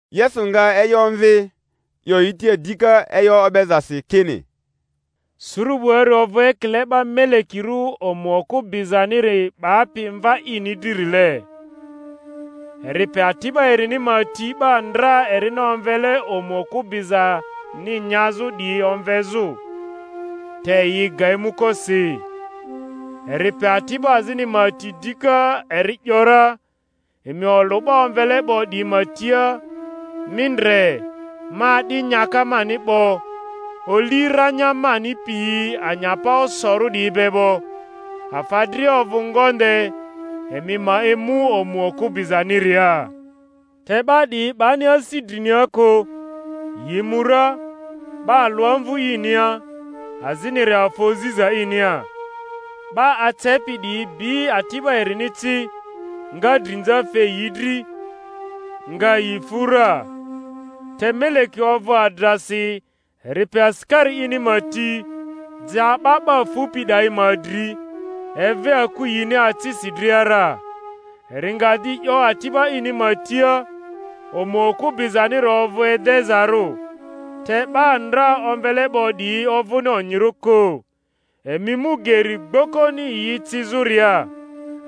Yesu nga e'yo omvi, 'yo yi tia dika e'yo o'bezasi, kini, Suru 'buari ovᴜ ekile 'ba melekirᴜ omu okᴜ bizaniri 'bapi mva ini drirlie, eri pe ati'ba erini ma ti 'ba ndra erini omvele omu okᴜ bizani nyazᴜ 'diyi omvezᴜ; te yi ga emuko si. Eri pe ati'ba azini ma ti dika, eri ‘yora, Emi olᴜ 'ba omvele 'bo 'diyi ma tia, Mi ndre, ma a'di nyaka mani 'bo, oli ranya mani piyi anyapa osorᴜ 'diyi be 'bo, afa dria ovᴜ ngonde; emi ma emu omu okᴜ bizaniria. Te 'ba 'diyi 'bani asi drinia kᴜ, yi mu ra, 'ba alᴜ amvᴜ inia, aziniri afa oziza inia; 'ba acepi 'diyi bi ati'ba erini ci, nga drinza fe yi dri, nga yi fu ra. Te meleki ovᴜ adrasi; eri pe asikari ini ma ti, ja 'ba 'ba fupi 'dayi ma dri, eve aku yini acisi dria ra. Eri nga di 'yo ati'ba ini ma tia, Omu okᴜ bizaniri ovᴜ edezarᴜ, te 'ba ndra omvele 'bo 'diyi ovᴜni onyirᴜ kᴜ. Emi mu geri gbokoni yi ecizᴜria,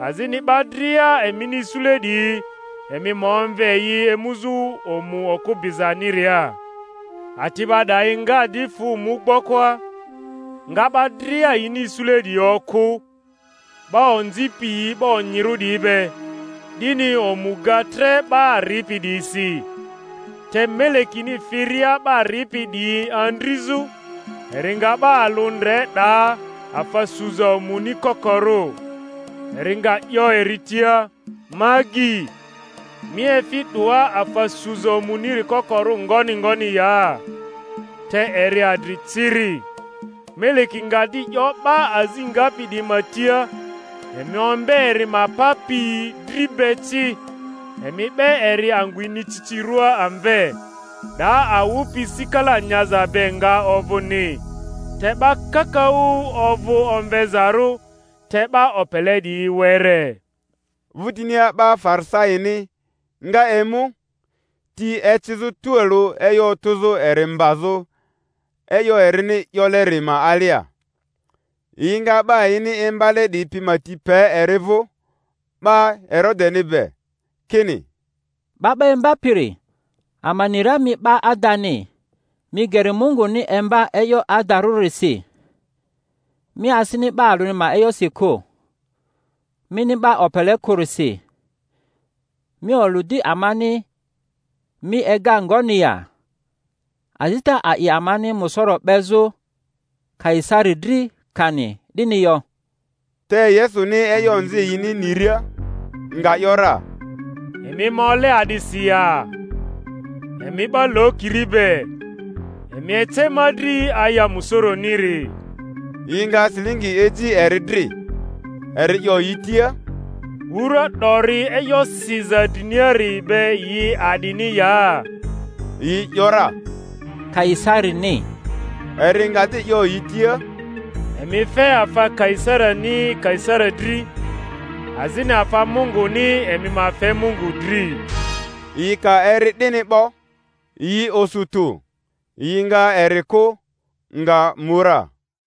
azini 'ba dria emini isule 'diyi, emi ma omve yi emuzᴜ omu okᴜ bizaniria. Ati'ba 'dayi nga di fᴜ mu gbokoa, nga 'ba dria yini isule 'diyi okᴜ, 'ba onzi piyi 'ba onyirᴜ 'diyi be; 'dini omu ga tre 'ba ripi 'diyisi. Te melekini firia 'ba ripi 'diyi andrizᴜ, eri nga 'ba alᴜ ndre 'daa afa suza omuni kokorᴜ; eri nga 'yo eri tia, Ma agyi, mi efi 'doa afa suza omuniri kokorᴜ ngoni ngoni ya? Te eri adri ciri. Meleki nga di 'yo 'ba azi ngapi 'diyi ma tia, Emi ombe eri ma pa pi dri be ci, emi 'be eri angᴜ inicicirᴜa amve; 'daa awᴜ pi sikala nyaza be nga ovᴜni. Te 'ba kakaᴜ ovᴜ omvezarᴜ, te 'ba opele 'diyi were. Vᴜtinia 'ba Farisaini nga emu, ti ecizᴜ tualᴜ e'yo otᴜzᴜ eri mbazᴜ e'yo erini 'yoleri ma alia. Yi nga 'ba yini imbale 'diyi pi ma ti pe eri vᴜ 'ba Herodeni be, kini, 'Ba 'ba Imbapiri, ama ni ra mi 'ba adani, mi geri Munguni imba e'yo adarᴜrisi, mi asini 'ba alᴜni ma e'yosi kᴜ; mini 'ba opele kᴜrisi. Mi olᴜ di amani, mi ega ngoni ya? Azita a'i amani musoro 'bezᴜ Kaisari dri, kani 'dini yo? Te Yesuni e'yo onzi yini niria, nga ‘yora, Emi ma ole a'disi ya, emi 'ba lokiri be? Emi ece ma dri aya musoroniri. Yi nga silingi eji eri dri. Eri 'yo yi tia, Wura 'dori e'yo siza driniari be yi a'dini ya? Yi ‘yora, Kaisarini. Eri nga di 'yo yi tia, Emi fe afa Kaisarini Kaisari dri, azini afa Munguni emi ma fe Mungu dri. Yi ka eri 'dini 'bo, yi osu tᴜ; yi nga eri kᴜ, nga mu ra.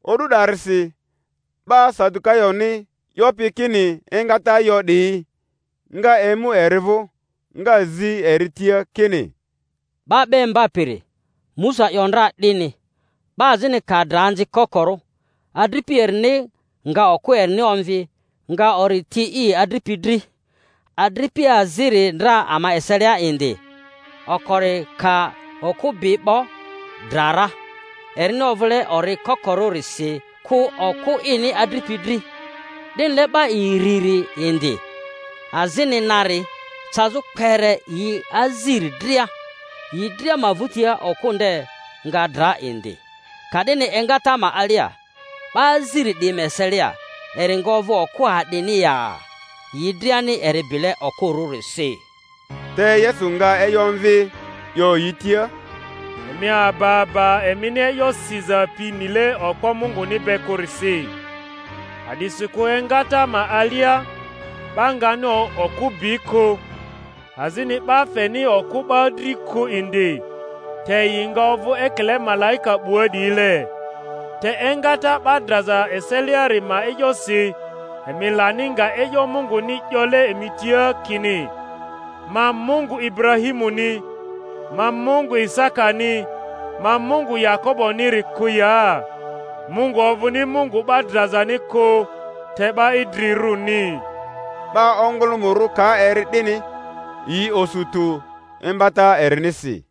O'du 'darisi 'ba Sadukayoni, 'yopi kini engata yo 'diyi, nga emu eri vᴜ, nga zi eri tia kini, 'Ba 'ba Imbapiri, Musa 'yo ndra 'dini, 'Ba azini ka dra anzi kokorᴜ, adripi erini nga okᴜ erini omvi, nga ori ti i adripi dri. Adripi aziri ndra ama eselia indi; okori ka okᴜ bi 'bo, dra ra, erini ovᴜle ori kokorᴜrisi kᴜ okᴜ ini adripi dri. 'Dinile 'ba iriri indi, azini nari, cazᴜ kpere yi aziri dria. Yi dria ma vᴜtia okᴜ nde nga dra indi. Ka'dini engata ma alia, 'ba aziri 'diyi ma eselia, eri nga ovᴜ okᴜ a'dini ya? yi driani eri bile okᴜrᴜrisi. Te Yesu nga e'yo omvi, 'yo yi tia, Emi aba aba emini e'yo siza pi nile okpo Munguni be kᴜrisi. A'disikᴜ engata ma alia 'ba ngani okᴜ bi kᴜ, azini 'ba feni okᴜ 'ba dri kᴜ indi, te yi nga ovᴜ ekile malaika 'bua 'diyile. Te engata 'ba draza eseliari ma e'yosi, emi lani nga e'yo Munguni 'yole emi tia kini, Ma Mungu Iburahimuni, ma Mungu lsakani, ma Mungu Yakoboni-ri kᴜ ya? Mungu ovᴜni Mungu 'ba drazani kᴜ, te 'ba idrirᴜni. 'Ba ongᴜlᴜmᴜrᴜ ka eri 'dini, yi osu tᴜ imbata erinisi.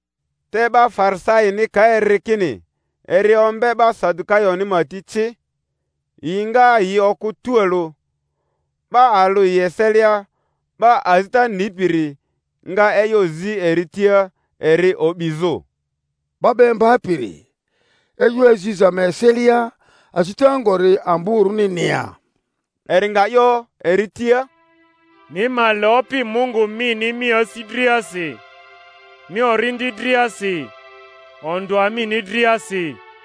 Te 'ba Farisaini ka eri kini eri o mbe 'ba Sadukayoni ma ti ci, yi nga yi okᴜ tualᴜ. 'Ba alᴜ yi eselia, 'ba azita nipiri, nga e'yo zi eri tia eri o'bizᴜ. 'Ba 'ba Imbapiri, e'yo aziza ma eselia, azita ngori amborᴜnini ya? Eri nga 'yo eri tia, Mi ma le Opi Mungu mini mi asi driasi, mi orindi driasi, ondᴜa mini driasi.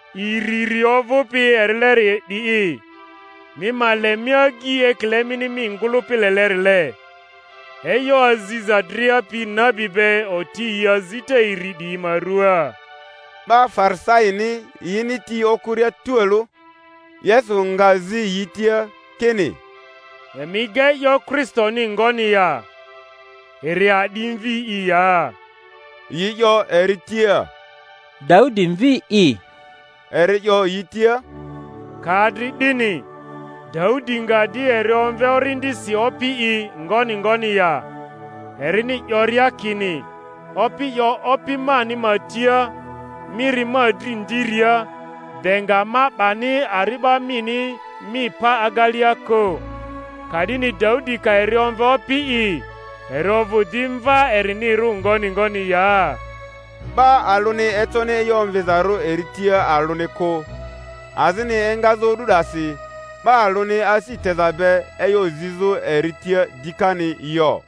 Iriri ovᴜpi erileri 'di'i, Mi ma le mi agyi ekile mini mi ngᴜlᴜpi lelerile. E'yo aziza dria pi nabi be oti yi azita iri 'diyi ma rᴜaa. 'Ba Farisaini yini ti okᴜria tualᴜ, Yesu nga zi yi tia, kini, Emi ega e'yo Kristoni ngoni ya? Eri a'di mvi'i ya? Yi 'yo eri tia, Daudi mvi'i. Eri 'yo yi tia, Ka adri 'dini, Daudi nga di eri omve Orindisi, Opi'i, ngoni ngoni ya, erini 'yoria kini, Opi 'yo Opi mani ma tia, Mi ri ma dri ndiria, de nga ma 'bani ari'ba mini mi pa agelea kᴜ? Ka'dini Daudi ka eri omve Opi'i, eri ovᴜ di mva erinirᴜ ngoni ngoni ya? 'Ba alᴜni econi e'yo omvizarᴜ eri tia alᴜni kᴜ, azini engazᴜ o'du 'dasi 'ba alᴜni asi teza be e'yo zizᴜ eri tia dikani yo.